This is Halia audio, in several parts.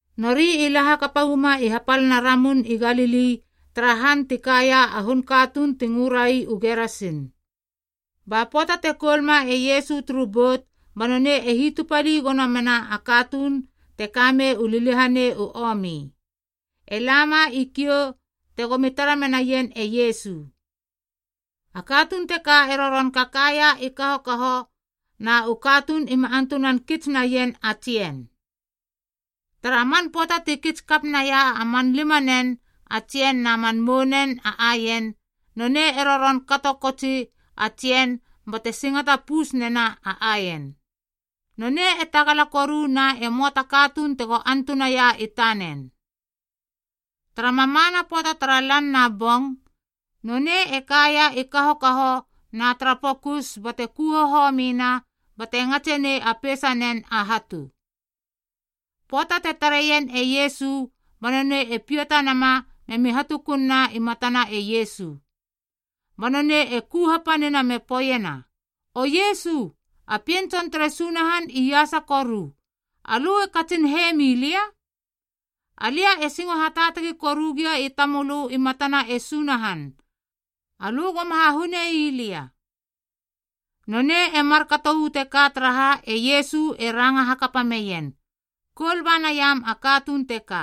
Nori i la hakapa uama i hapalana Ramun i Galili tara han ti kaia a hun katuun ti ngörai u Gerasin. Ba pöata te koulma e Iesu turu bout ba nonei e hitupali gono mena a katuun te kamei u liliahanei u omi, e lama i kiou tegomi tara menaien e Iesu. A katuun teka e roron kakaia i kahokahoa na u katuun ima antunan kits naien a tsien. Tara man pöata ti kits kakap naia man limanen a tsien na man mounen a aien, nonei e roron kato kotsi a tsien bate singata pus nena a aien. Nonei e tagala koru na e möa ta katuun tego antunaia i tanen. Tara mamana pöata tara lan na bong, nonei e kaia i kahokaho na tara pokus bate ku hohomina bate ngatse nei a peisanen a hatu. Pöata te tareien e Iesu ba nonei e piata nama memi hatukununa i matana e Iesu. Ba nonei e ku hapanina me poeiena, “O Iesu, a Pien Tson tere Sunahan Iasa Koru, alö e katsin he mi lia? Alia e singo hataatagi koru gia i tamölö i matana e Sunahan, alö goma hahune ii lia.” Nonei e markato uu teka taraha e Iesu e ranga hakapa meien, “Koul ba naiam a katuun teka.”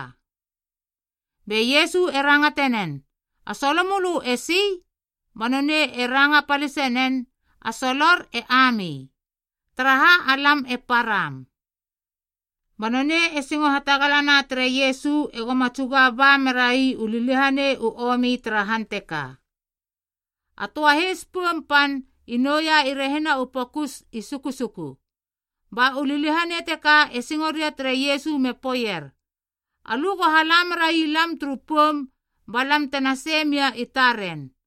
Be Iesu e rangate nen, “A solo mölö esi?” Ba nonei e ranga palisenen, “A solor e Ami, taraha alam e param.” Ba nonei e singo hatagalana tere Iesu egoma tsuga ba merai u liliahanei u omi tara han teka. A töa heis poum pan i nouia i rehina u pokus i sukusuku. Ba u liliahanei teka e singo ria tere Iesu me poeier, “Alö go hala meraia lam turu poum ba lam tena sei mia i taren.”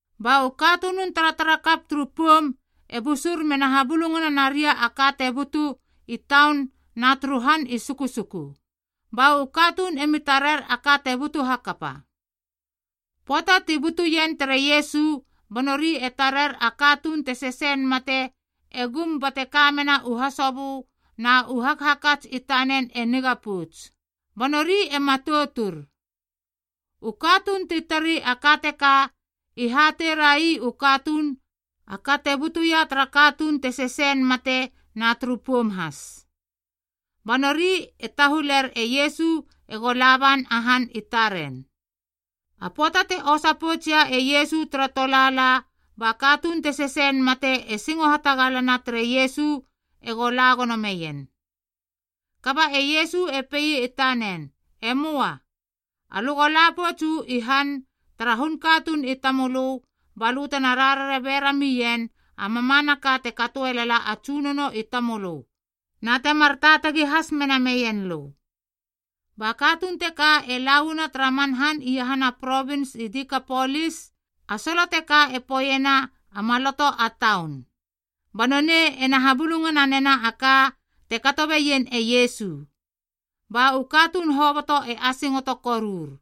Ba u katunun taratarakap turu poum e busur mena habulungana naria a ka te butu i taun na turu han i sukusuku, ba u katuun emi tarer a ka te butu hakapa. Pöata ti butuien tere Iesu ba nori e tarer a katuun te kamei a liliahanei e gum bate kamena u hasobö na u hakhakats i tanen e niga pouts. Ba nori e matoutur. U katuun ti tarei a ka teka i hatei ra ii u katuun a ka te butuia tara katuun te kamei a liliahanei na turu poum has. Ba nori e tahuler e Iesu ego la ban a han i taren. A pöata te osa poutsia e Iesu tara tolaala ba katuun te kamei a liliahanei e singo hatagalana tere Iesu ego la gono meien. Kaba e Iesu e pei i tanen, “Emoa, alö go la pouts uu i han tara hun katuun i tamölö ba lö tena rarare bera mien a mamanaka te katoe lala a Tsunono i tamölö na temar taatagi has mena meien lö.” Ba katuun teka e lauana tara man han iahana provins i Dikapolis (a solo teka e poeiena a Maloto a Taun). Ba nonei ena habulungana nena a ka te kato beien e Iesu. Ba u katuun hoboto e asingoto korur.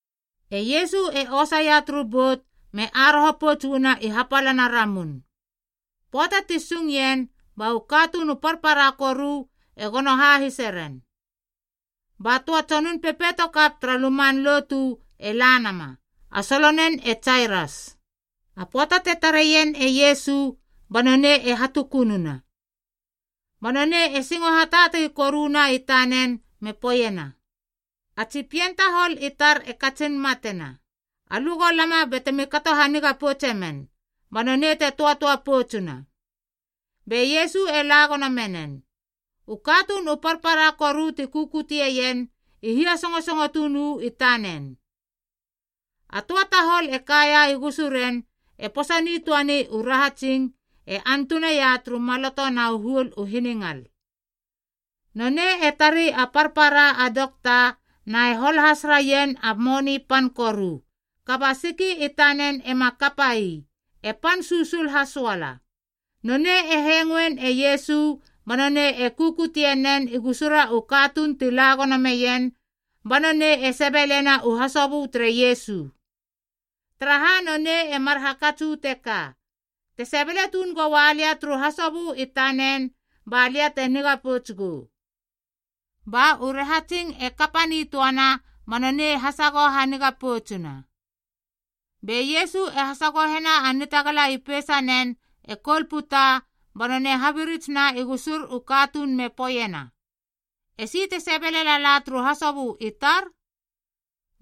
E Iesu e osa ia turu bout me aroho pouts uana i hapalana ramun. Pöata ti sung ien, ba u katuun u parpara koru e gono hahise ren. Ba töa tsonun pepeitokap tara luman lotu e la nama, a solonen e Jairas. A pöata te tareien e Iesu ba nonei e hatukununa. Ba nonei e singo hataatagi koruna i tanen me poeiena, “A tsi pien tahol i tar e katsin matena. Alö go lama batemi kato haniga poutsemen ba nonei te töatöa poutsuna.” Be Iesu e la gono menen. U katuun u parpara koru ti kukuteien i hia songosongo tuun uu i tanen. A töa tahol e kaia i gusuren e posa nitöani u rahatsing e antuna ia turu maloto na u huol u hiningal. Nonei e tari a parpara a dokta na e hol has raien a moni pan koru, kaba a siki i tanen ema kapa ii. E pan susul hasoala. Nonei e hengoein e Iesu ba nonei e kukutie nen i gusura u katuun ti la gono meien ba nonei e sebelena u hasobö tere Iesu. Taraha nonei e mar hakats uu teka, “Te sebele tuun goua lia turu hasobö i tanen ba lia te niga pouts gou.” Ba u rahatsing e kapa nitöana ba nonei e hasagoho haniga poutsuna Be Iesu e hasagohena a nitagala i peisanen e koul puta ba nonei e habirits na i gusur u katuun me poeiena, “Esi te sebele lala turu hasobö i tar?”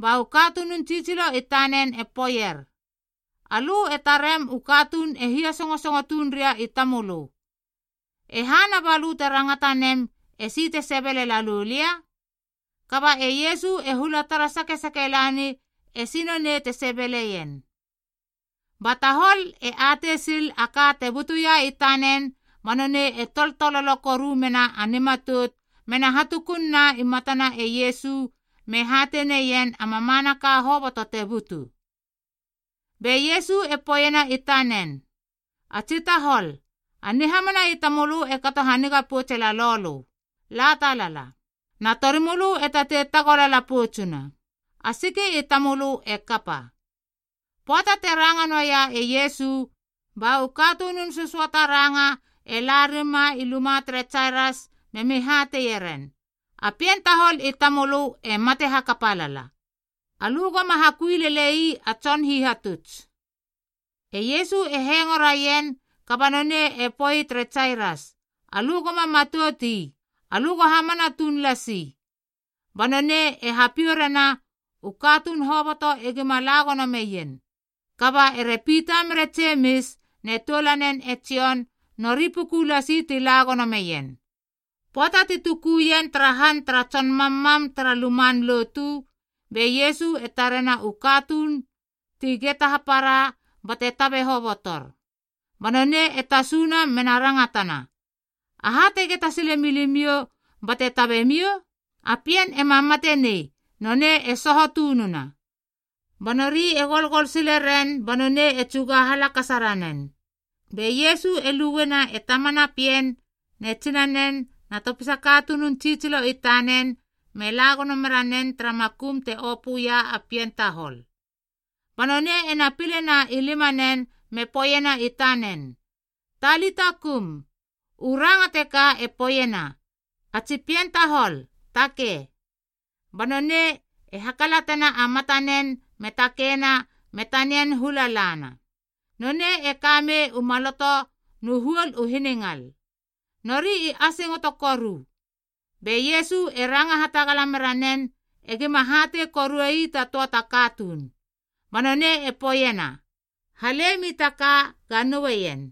Ba u katunun tsitsilo i tanen e poeier, “Alö e tarem u katuun e hia sösongo tuun ria i tamölö. E hana balö te rangata nem, esi te sebele lalou lia?” Kaba e Iesu e hula tara sakesake lani esi nonei te sebeleien. Ba tahol e atei sil a ka te butuia i tanen ba nonei e toltololo koru mena a nimatout mena hatukunna i matana e Iesu me hatei neien a mamanaka hoboto te butu. Be Iesu e poeiena i tanen, “A tsi tahol, a nihamana i tamölö e kato haniga poutse lalou lö. La talala, na torimölö e tatei tagolala poutsuna. A siki i tamölö e kapa.” Pöata te ranga noaia e Iesu, ba u katunun sösöata ranga e la rima i luma tere Jairas memi hateie ren, “A pien tahol i tamölö e mate hakapa lala. Alö goma hakui lele ii a Tson Hihatuts.” E Iesu e hengo raien kaba nonei e poe tere Jairas, “Alö goma matout ii. Alö go hamana tuun lasi.” Ba nonei e hapiou rena u katuun hoboto egima la gono meien. Kaba ere Pita mere Jemis ne toulanen e Jon nori puku lasi ti la gono meien. Pöata ti tukuien tara han tara tson mammam tara luman lotu, be Iesu e tarena u katuun ti geta hapara bate tabe hobotor. Ba nonei e tasuna mena rangatana, “Aha te geta sile milimiou bate tabe miou? A pien ema mate nei. Nonei e soho tununa.” Ba nori e golgol sileren ba nonei e tsuga halakasa ranen. Be Iesu e luena e tamana a pien ne tsinanen na topisa katunun tsitsilo i tanen me la gono mera nen tara makum te opöia a pien tahol. Ba nonei ena pilena i limanen me poeiena i tanen, “Talita kum.” U ranga teka e poeiena, “A tsi pien tahol, takei.” Ba nonei e hakalatena a matanen me takeina me tanian hula lana. (Nonei e ka mei u maloto nu huol u hiningal). Nori i asingoto koru. Be Iesu e ranga hatagala mera nen egima hatei korue ii ta töa ta katuun. Ba nonei e poeiena, “Halemi ta ka ga noueien.”